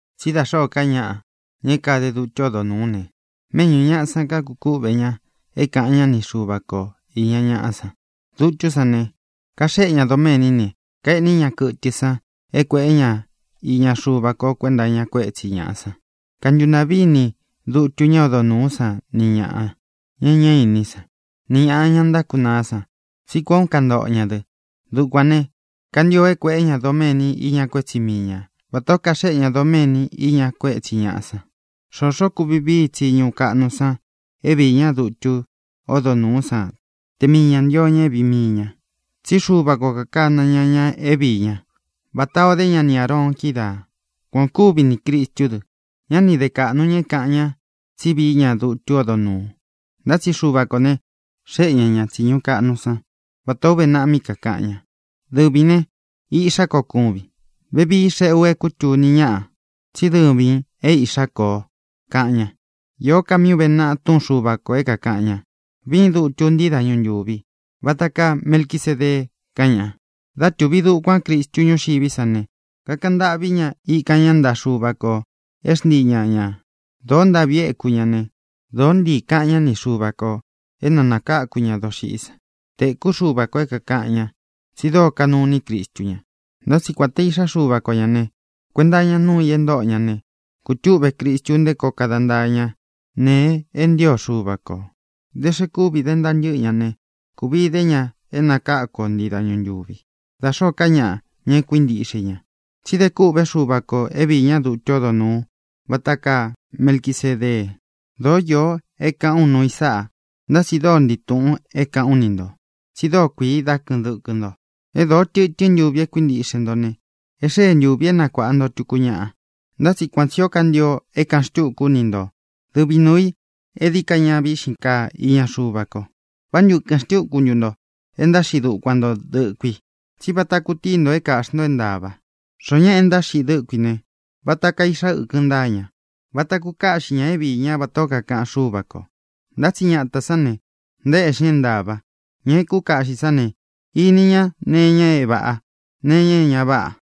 Tsí da xōó ka ñaꞌa, ña é kade dutu ódo nūú ne, méꞌñū ñaꞌa san kakukúꞌve ña é kāꞌan ñá ni Xuva ko īña ñaꞌa san. Dutú san ne, kaxéꞌe ña doméní ne, kaeꞌní ña kɨtɨ san é kuēꞌé ña iña Xuva ko kuenta iña kuétsi ñāꞌa san. Kantuntaꞌví ini dutu ñá odo nūú san ni ñāꞌa, ña é ña íni san, ni ñāꞌa, ña ntákunaá san, tsí kuān ó kantoꞌo ñā dɨ. Dukuān né, kantio é kuēꞌé ña doméni iña kuétsi mii ña vatā ó kaxéꞌe ña doméni iña kuétsi ñāꞌa san. Xoxo kuvi vií i tsiñu kaꞌnu san é viī ñá dutu ódo nūú san te mii ñā ntio ña é vīi mii ña, tsí Xuva ko kākana ña ña é viī ñá, vatā o dé ña ni Āroon kídaā. Kuan ō kúvi ni Crīstú dɨ. Ñá ni de kāꞌnu ña é kāꞌan ñá tsi vií ña dutu ódo nūu, ntá tsi Xuva kō ne, xéꞌe ña ñā tsiñu kaꞌnu san, vatā ó uve naꞌa mí kakāꞌan ña: Dɨvīn ne, Iꞌxá ko kúvin. Vevii xeꞌé u é kūtuni ñaꞌa tsí dɨvīn é iꞌxá ko o, kaꞌan ña. Īó ka míꞌi ūve naꞌa túꞌun Xuva kō é kākaꞌan ña: Viín dutu ntii dáñu ntūvi, vata kaa Melquisedee, kaꞌan ña. Dá tūvi dukuán Cristu ñúxiví sa ne, kakaꞌan ntâꞌví ña, íkan ña ntaꞌa Xuva kō é xntii ña ñā. Dōó ntāꞌvi éku ña ne, dōó ntiī kaꞌan ñá ni Xuva kō é na nākáku ña doxiꞌí san. Tēkú Xuva kō é kākaꞌan ña, tsi dóo kanuu iní Cristu ña. Ntá tsi kuān te Iꞌxá Xuva ko ñā ne, kuenta iña núu i e ntóꞌo ña ne, kūtúꞌve Cristu nté koo kada ntaa ña nēe é ntio Xuva kō. Da xe kúvi dé ntaa ntɨ́ꞌɨ ña ne, kuvi dé ña é nakáku o ntii dañu ntūví, da xōó ka ñaꞌa, ña e kuíntiꞌxe i ña. Tsi de kûꞌvé Xuva kō é viī ñá dutu ódo nūu vata kaa Melquisedee. Dōó īo e káꞌān ú nuu i sáꞌa, ntá tsi dóo ntii tūꞌun é kāꞌán u ni ntō, tsi dóo kuii dá kɨꞌɨn dɨkɨ nto. É dōo tɨtɨ́n ntuvi é kuíntiꞌxe nto ne, e xée ntūvi é nakuāꞌa nto tuku ñaꞌa. Ntá tsi kuan tsī ó kantio é kāꞌan xtúku ú ni nto dɨvi nuū í e dií ka ña víꞌxin kaa iña Xuva ko. ¿Vá ntu ɨkɨn xtúku ntu nto é ntáxiꞌi dukuan ntō dɨkui? Tsí vata kutíi nto é kāꞌxi nto é ntāva. Xoó ñaꞌa e ntáxiꞌi dɨ́kui ne, vata kaa iꞌxa ɨ́kɨn ntáa ña. Váta kukaꞌxi ña é viī ñá vatā ó kakaꞌan Xúva kō. Ntá tsi ñatā sán ne, ntaéꞌxi ña é ntāva. Ña e kúkaꞌxī sán ne, ini ña nee iña é vāꞌa, nee iña é ña váꞌa.